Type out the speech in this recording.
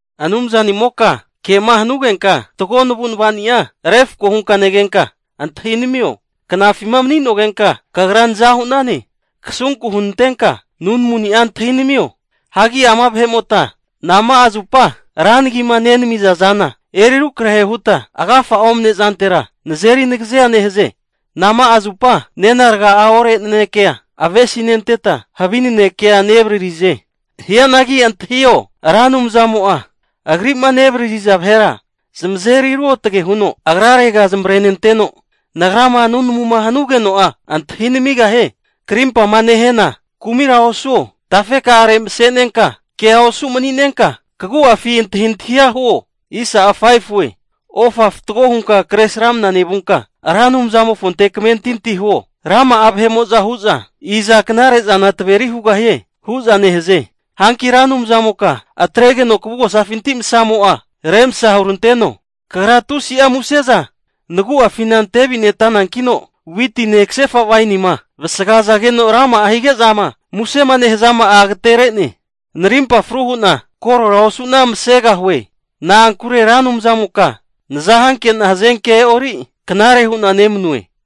Anumzanimoka kema hanugenka fatgo navu'navani'a refko hunka negenka antahinamio! Knafima mani'nogenka kagra naza hu'nane. Kasunku hunantenka nunamu'ni'a antahinamio. Hagi ama vahe'mota nama'a zupa ra nagima nenamiza zana eri rukrahe huta, agafa'a omne'zantera nazeri nagazea nehaze? Nama'a zupa nena raga ore nanekea avesinenteta havi nanekea nevararize? Hianagi antahio, Ra Anumzamo'a agri'ma nevaririza vahera zamazeri ruotge huno agrarega zamavarenenteno, nagrama nunamuma hanugeno'a antahi namigahie. Krimpama nehena kumira osuo, tafeka'are masenenka kea osu mani'nenka kagu'afi antahintahia huo. Ofa fatgo hunka Kresramana nevunka, Ra Anumzamofonte kamentinti huo. Rama'a hu'za, iza knare'zana taveri hugahie? hu'za nehaze. Hanki Ra Anumzamoka atregeno kavugosafinti masamo'a remsa huranteno. Kagra tusi'a muse'za nagu'afina ante avitenantankeno witine kasefa wainima vasagazageno rama'a hige'zama musema nehazama'a agatere'ne. Narimpa fru hu'na korora osu'na masegahue. Na'ankure Ra Anumzamoka naza hanke'na hazenkea e'ori knare hu'na nemanue.